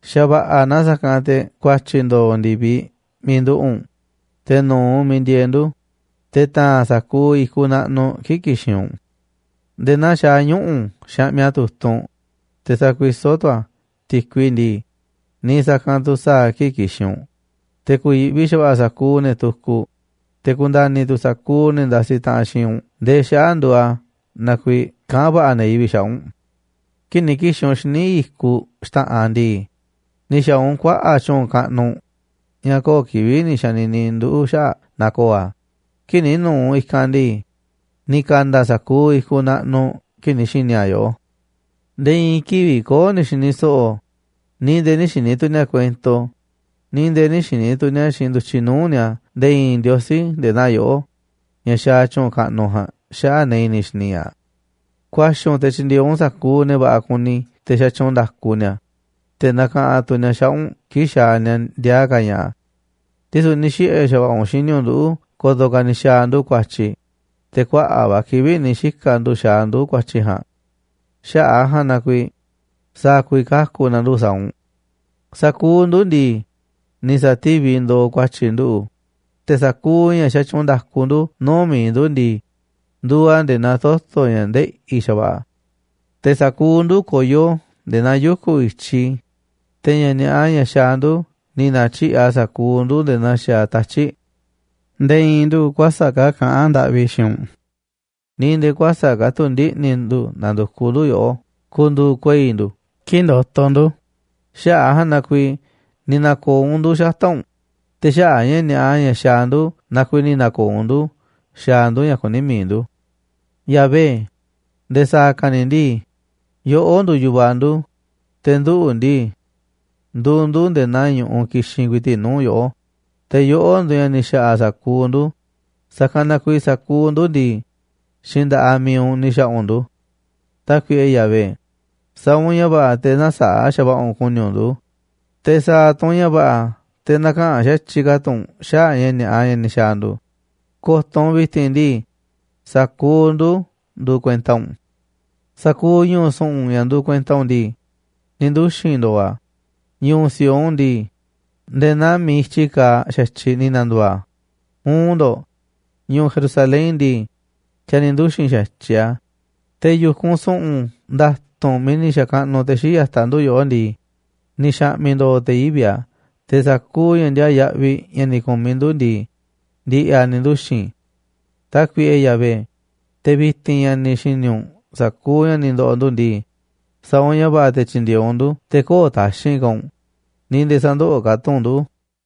Xa̱ va̱ꞌa̱ na sa̱kanꞌ te̱ ku̱a̱tyi̱ ndo̱o̱ ndi̱viꞌ miiꞌ nduꞌu̱ꞌ u̱nꞌ, te̱ nu̱u̱ u̱nꞌ miiꞌ ndieeꞌ ndu̱, te̱ ta̱a̱n sa̱kuuꞌ i̱kuꞌ naꞌnuꞌ kii̱ꞌ ki̱xi̱n u̱nꞌ. Nde̱e̱ naa xaaꞌ ñuꞌu̱ xaꞌmiꞌ a̱ tu̱tunꞌ, te̱ sakuisó tu̱ a̱ ti̱kui ndii, niiꞌ sa̱kanꞌ tu̱ sa̱a̱ a̱ kii̱ꞌ ki̱xi̱n u̱nꞌ, te̱ ku̱yi̱ꞌvi xa̱va̱ꞌa̱ sa̱kuuꞌ ne̱ tukuꞌ, te̱ ku̱nda̱ni̱ tu̱ sa̱kuuꞌ ne̱ ndasiꞌ taꞌanꞌ xiinꞌ u̱nꞌ ndee xaꞌa̱ꞌ nduuꞌ a̱ na kuiiꞌ kaꞌán va̱ꞌa̱ ne̱ yivi̱ꞌ xaꞌa̱ꞌ u̱nꞌ. Kii̱ꞌ ni̱ ki̱xi̱n u̱nꞌ xíniꞌ i̱kuꞌ xta̱ꞌanꞌ ndii, ni̱ xa̱a̱ u̱nꞌ kuaꞌa̱ꞌ tyu̱u̱n kaꞌnuꞌ ña̱ köo̱ꞌ kivi̱ꞌ ni̱ xa̱ni̱ni̱ nduꞌu̱ꞌ xaꞌa̱ꞌ naaꞌ ko̱o̱ a̱. Kii̱ꞌ ni̱ nu̱u̱ u̱nꞌ i̱kanꞌ ndii, ni̱ ka̱nda̱ sa̱kuuꞌ i̱kuꞌ naꞌnuꞌ kii̱ꞌ ni̱ xi̱ni̱ a̱ yoꞌó. Nde̱e̱ i̱i̱n kivi̱ꞌ köo̱ꞌ ni̱ xi̱ni̱ so̱ꞌo̱, ni̱ nde̱e̱ nï̱ xi̱ni̱ tu̱ ni̱a̱ kuento, ni̱ nde̱e̱ nï̱ xi̱ni̱ tu̱ ni̱a̱ xiinꞌ ndu̱tyiꞌ nuu̱ꞌ ni̱a̱ nde̱e̱ i̱i̱n ndiosí nde̱e̱ naa yoꞌó ña̱ xaaꞌ tyu̱u̱n kaꞌnuꞌ ja̱a̱nꞌ xaꞌa̱ꞌ ne̱ i̱ni̱ xini ña̱ꞌaꞌ. Ku̱a̱xi̱ u̱nꞌ te̱ tyindieeꞌ u̱nꞌ sa̱kuuꞌ ne̱ va̱ꞌa̱ kuni te̱ xatyuunꞌ nda̱ku ni̱a̱, te̱ nakaꞌanꞌ tu̱ ni̱a̱ xaꞌa̱ꞌ u̱nꞌ kii̱ꞌ xaaꞌ ni̱a̱ ndiaa ka̱ ña̱ꞌa̱. Ndisu̱ ni̱ xiꞌe̱ xa̱va̱ꞌa̱ u̱nꞌ xini u̱nꞌ nduꞌu̱ꞌ ko̱to̱ ka̱ ni̱ xa̱a̱ ndu̱ ku̱a̱tyi̱. Te̱ kuaꞌa̱ꞌ va̱ kivi̱ꞌ ni̱ xika̱ ndu̱ xaaꞌ ndu̱ ku̱a̱tyi̱ ja̱a̱nꞌ. Xaꞌa̱ꞌ a̱ ja̱a̱nꞌ na kuiiꞌ, ¿sa̱a̱ ku̱vi̱ kaku̱ na̱ ndu̱ sa̱a̱ u̱nꞌ? Sa̱kuuꞌ ndu̱ ndii, ni̱ sa̱tíviꞌ ndooꞌ ku̱a̱tyi̱ nduꞌu̱ꞌ, te̱ sa̱kuuꞌ ña̱ xatyuunꞌ nda̱ku ndu̱ nuu̱ꞌ mi̱iꞌ ndu̱ ndii, nduuꞌ a̱ nde̱e̱ naa toto̱ ña̱ ndeꞌi̱ xa̱va̱ꞌa̱. Te̱ sa̱kuuꞌ ndu̱ koyó nde̱e̱ naa yuku̱ i̱tyi, te̱ ña̱ ni̱a̱ꞌa ña̱ xaaꞌ ndu̱ ni̱ na̱tyiꞌi̱ꞌ a̱ sa̱kuuꞌ ndu̱ nde̱e̱ naa xaaꞌ tatyi̱ꞌ. Nde̱e̱ i̱i̱n ndu̱ kuäsa̱ꞌ ka̱ kaꞌán ndaꞌvi xiinꞌ u̱nꞌ, ni̱ nde̱e̱ kuäsa̱ꞌ ka̱ tu̱ ndiꞌni̱ ndu̱ na̱ndu̱kuꞌ ndu̱ yoꞌó ku̱ndu̱u̱ kuei̱ ndu̱ kii̱ꞌ ndotoꞌ ndu̱. Xaꞌa̱ꞌ a̱ ja̱a̱nꞌ na kuiiꞌ ni̱ na̱ko̱o̱ u̱nꞌ ndu̱ xata̱ꞌ u̱nꞌ, te̱ xaꞌa̱ꞌ ña̱ ni̱a̱ꞌa ña̱ xaaꞌ ndu̱ na kuiiꞌ ni̱ na̱ko̱o̱ u̱nꞌ ndu̱ xaaꞌ ndu̱ ña̱ kuní mi̱iꞌ ndu̱. Yahvé, nde̱e̱ sa̱a̱ ka̱ ni̱ ndii, yoꞌó nduuꞌ yu̱vaꞌ ndu̱, te̱ nduꞌu̱ ndii, nduuꞌ ndu̱ nde̱e̱ naa ñu̱ꞌuꞌ kixinꞌ ku̱i̱ti̱ꞌ nuu̱ꞌ yoꞌó. Te̱ yoꞌó nduuꞌ ña̱ ni̱ xa̱ꞌa̱ sa̱kuuꞌ ndu̱, sa̱kanꞌ na kuiiꞌ sa̱kuuꞌ ndu̱ ndii, xiinꞌ nda̱ꞌaꞌ mi̱iꞌ u̱nꞌ ni̱ xa̱ꞌa̱ u̱nꞌ ndu̱. Tákuiꞌe Yahvé, sa̱a̱ u̱nꞌ ña̱ va̱ꞌa̱ te̱ nä̱saa̱ꞌ xa̱va̱ꞌa̱ u̱nꞌ ku̱ni̱ u̱nꞌ ndu̱. Te̱ sa̱a̱ tu̱ u̱nꞌ ña̱ va̱ꞌa̱ te̱ nä̱ka̱ꞌanꞌ xa̱tyiꞌ ka̱ tu̱ u̱nꞌ xaꞌa̱ꞌ ña̱ ni̱a̱ꞌa ña̱ ni̱ xa̱a̱ ndu̱. Ko̱to̱ u̱nꞌ vi̱ti̱n ndii, sa̱kuuꞌ ndu̱ nduuꞌ kuenta u̱nꞌ. Sa̱kuuꞌ ñu̱u̱ su̱ꞌu̱n ña̱ nduuꞌ kuenta u̱nꞌ ndii, ni̱ nduxi̱n ndo̱o̱ a̱. Ñu̱u̱ Sión ndii, nde̱e̱ naa miiꞌ i̱tyi kaaꞌ xa̱tyiꞌ ni̱ na̱ndu̱u̱ a̱. Uun ndo̱ꞌ, ñu̱u̱ Jerusalén ndii, xa̱ ni̱ nduxi̱n xa̱tyiꞌ a̱. Te̱ yu̱kunꞌ su̱ꞌu̱n nda̱tu̱nꞌ miiꞌ ni̱ xa̱kaꞌnuꞌ te̱ xii̱ꞌ ya̱taꞌ ndu̱ yoꞌó ndii, ni̱ xa̱ꞌmi̱ ndo̱o̱ te̱ yivi̱ꞌ a̱. Te̱ sa̱kuuꞌ ña̱ ndiaa yaꞌviꞌ ña̱ ni̱ ku̱miꞌ ndu̱ ndii, ndi̱ꞌi̱ a̱ ni̱ nduxi̱n. Tákuiꞌe Yahvé, te̱ vi̱ti̱n ña̱ ni̱ xi̱ni̱ u̱nꞌ sa̱kuuꞌ ña̱ ni̱ ndo̱ꞌo̱ ndu̱ ndii, sa̱a̱ u̱nꞌ ña̱ va̱ꞌa̱ te̱ tyi̱ndi̱e̱eꞌ u̱nꞌ ndu̱, te̱ kö̱o̱ꞌ taxi̱nꞌ ka̱ u̱nꞌ, ni̱ nde̱e̱ sä̱ndoꞌoꞌ ka̱ tu̱ u̱nꞌ ndu̱.